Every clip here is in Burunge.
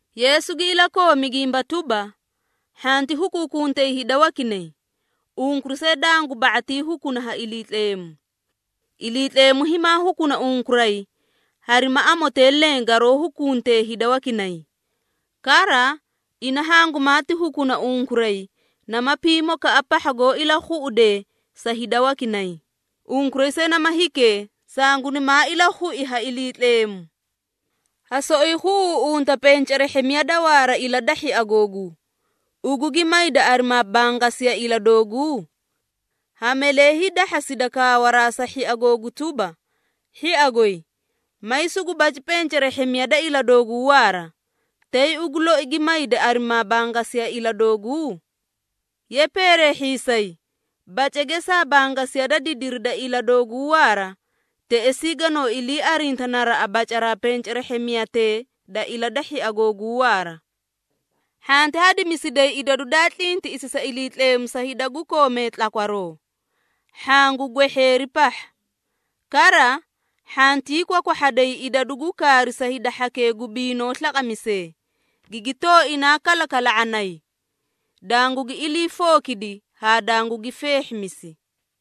Yeesu gi ilakoomi gimba tuba, “Hhanti hukuukuntay hida wakinay, unkuray see dangu ba⁄atii hukuna ha Iliitleemu. Iliitleemu himaa hukuna unkuray harima amotee leẽ garoó hukunte hida wakinay. Kara, ina hangumaati hukuna unkuray nama pimokaꞌa pahha goó ilakhuꞌudee sa hida wakinay, unkuray see nama hikee, sangunimaa ilakhui ha Iliitleemu! Ha soꞌoyi khuꞌuuꞌunta pencerehhemiya da waara ila da hhia googuu, ugu gi mayda arimaa bangasiya ila dooguu? Ha malee hiidahhasida kaawaraa sa hhia googu tuba, ‘Hhia goy, may sugu baci pencerehhemiya da ila dooguu waara,’ tay ugu loi gi mayda arimaa bangasiya ila dooguu? Ye peereehhiisay! Bace geesaa bangasiya da didiri da ila dooguu waara, teꞌesii ganoo ilii arinta naraꞌa bacaraa pencerehhemiyatee da ila da hhia googuu waara. Hhanti hadimisiday idadu daa tlintiꞌisi sa Iliitleemu sa hida gu koomee tlakwaroo, hhaã gu gwehheeri pahha. Kara, hhantii kwakwahhaday idadu gu kaari sa hida hhakee gu biinoo slaqamisee, gigi tooinaa kalakala⁄anay, dangugi ilii fookidi haa dangugi feehhimisi.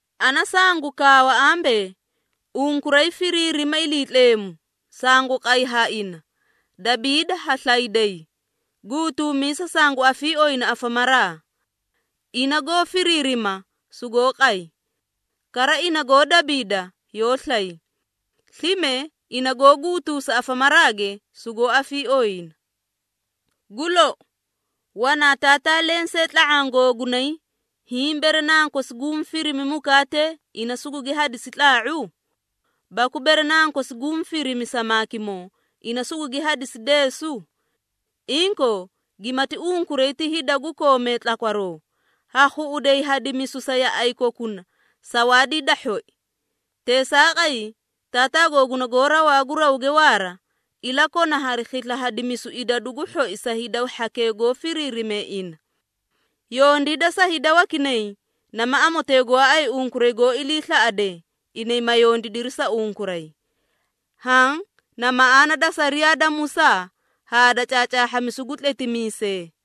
Ana sangu kaawa ambee, ‘Unkuray firiirima Iliitleemu, sangu qay ha ina, dabiida ha slayday, guutuumisa sangu afiiooyina afamaraa.’ Ina goó firiirima, sugoó qay. Kara ina goó dabiida, yoó slay. Slime ina goó guutuusa afamaraage, sugoó afiiooyina. Gu lou, wanaa taataa lensee tla⁄aã googunay, hiĩ bere nankosi guũ firimi mukaatee, ina sugugi hadisi tlaa⁄u? Baku bere nankosi guũ firimi samaakimoo, ina sugugi hadisi deesu? Inkoo, gimati unkuray ti hida gu koomee tlakwaroo, ha khuꞌuday hadimisu sa yaꞌay kokuna sawaadii da hhoi. Teesaaqay, Taataa googuna goó rawaa gu rawge waara, ilakona hari khisla hadimisu idadu gu hhoi sa hida hhakee goó firiirime ina. Yondiida sa hida wakinay, nama amotee gooay unkuray goó iliislaꞌadee, inay ma yondiidiri sa unkuray. Haã na maꞌaana da sariyaa da Musaa haa da caacaahhamisu gu tletimiisee.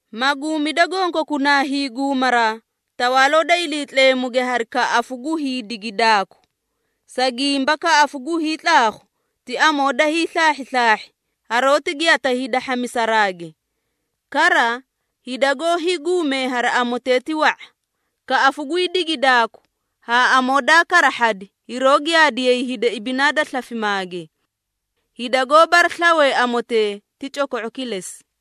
Maguumida gonkokunaa hiiguumaraa, Tawaaloo da Iliitleemuge hari kaꞌafu gu hiidigidaaku. Sa gimba kaꞌafu gu hiitlaakhu ti amoo da hiislaahhislaahi, haroóti giyata hida hhamisaraage. Kara, hida goó hiiguumee hari amotee ti wa⁄a. Kaꞌafu gwii digidaaku haa amoo daa karahhadi hiroó giyaadiyay hida ibinaa da slafimaage. Hida goó baraslawee amotee ti coko⁄o kilesi.”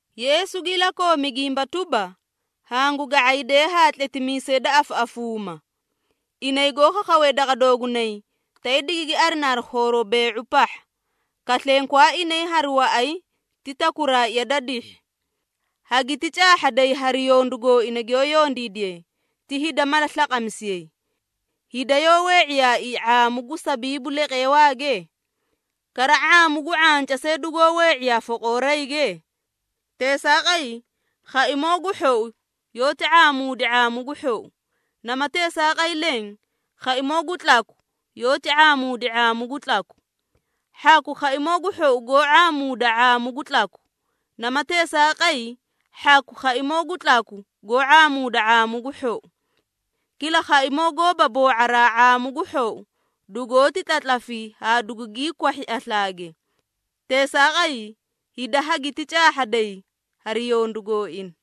Yeesu gi ilakoomi gimba tuba, “Hangu ga⁄iidee haa tletimiisee da afaꞌafuumaa. Inay goó khakhawee daqa doogunay, tay digigi arina hari khooroo bee⁄u pahha, kaslenkwaa inay hari waꞌay ti takuraaꞌa da dihhi. Hagiti caahhaday hari yondu gooina giyoó yondiidiye ti hida mala slaqamisiyay. Hida yoó wee⁄iyaaii ⁄aamu gu sabiibu leqeewaage? Kara ⁄aamu gu ⁄anca see dugoó wee⁄iyaa foqoorayge? Teesaaqay, khaimoo gu hhou yoóti ⁄aamuudi ⁄aamu gu hhou, nama teesaaqay leẽ, khaimoo gu tlaku yoóti ⁄aamuudi ⁄aamu gu tlaku. Hhaku khaimoo gu hhou goó ⁄aamuuda ⁄aamu gu tlaku, nama teesaaqay hhaku khaimoo gu tlaku goó ⁄aamuuda ⁄aamu gu hhou. Kila khaimoo goóba boo⁄araa ⁄aamu gu hhou, dugoóti tlatlafi haa dugugii kwahhi aslaage. Teesaaqay, hida hagiti caahhaday hari yondu gooina.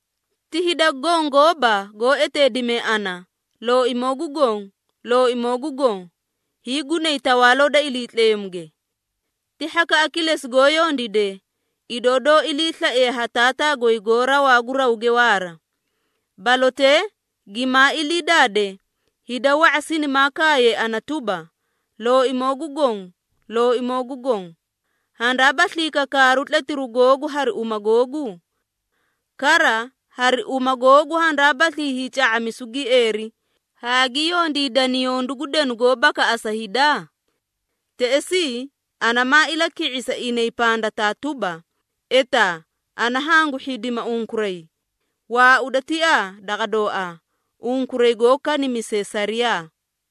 Ti hida goõ goóba goó eteedimee ana, ‘Looimoo gu Goõ, Looimoo gu Goõ,’ hiigunay Tawaaloo da Iliitleemuge. Ti hhakaꞌa kilesi goó yondiidee, idoo doó iliislaiye ha Taataa goy goó rawaa gu rawge waara. Balotee gimaa ilii daade, hida wa⁄a sinimaa kaayay ana tuba, ‘Looimoo gu Goõ, Looimoo gu Goõ, handaabaslii kakaaru tletiru googu hari uma googuu? Kara, hari uma googu handaabaslii hiica⁄amisu gieeri, haa gi yondiidani yondu gu denu goó bakaꞌasa hida?’ Teꞌesii, ana maa ilaki⁄isi inay pandataa tuba, ‘Etaa, ana hangu hhidima unkuray. Waauda tiaa daqa dooaa, unkuray goó kanimisee sariyaa!’”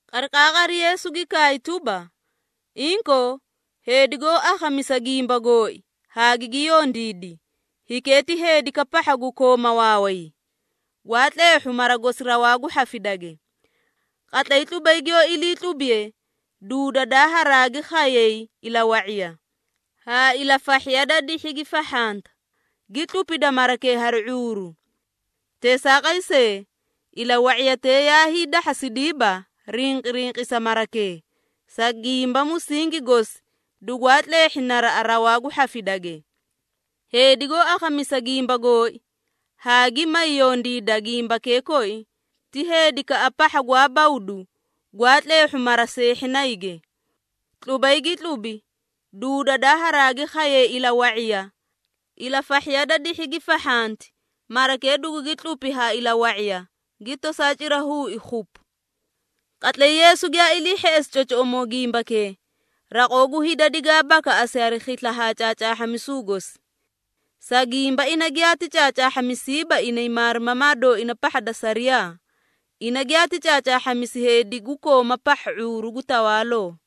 Qariqaaqari Yeesu gi kaay tuba, “Inkoo, heedi goó akhamisa gimba gooi haa gigi yondiidi, hikee ti heedikaꞌa pahha gu kooma waaway, gwaa tleehhu mara gosi rawaa gu hhafidage. Qatlay tlubay giyoó ilii tlubiye, duududaa haraagi khayay ilawa⁄iya, haa ilafahhiya da dihhi gi fahhanta, gi tlupita marakee hari ⁄uuru. Teesaaqay see, ilawa⁄iyatee yaa hiidahhasidiiba rinqirinqisa marakee, sa gimba musingi gosi dugwaa tleehhi naraꞌa rawaa gu hhafidage. Heedi goó akhamisa gimba gooi, haa gi may yondiida gimbakee koi, ti heedikaꞌa pahha gwaa bawdu gwaa tleehhu mara seehhinayge. Tlubay gi tlubi, duududaa haaragi khayay ilawa⁄iya, ilafahhiya da dihhi gi fahhanti, marakee dugugi tlupi ha ilawa⁄iya, gi tosaa cira huui khupu!” Qatlay Yeesu giyaa ilii hheꞌesi cocoꞌomoo gimbakee, raqoo gu hida digaa bakaꞌasi hari khisla ha caacaahhamisu gosi. Sa gimba ina giyaati caacaahhamisiiba inay maarimamaa dooina pahha da sariyaa, ina giyaati caacaahhamisi heedi gu kooma pahha ⁄uuru gu tawaaloo.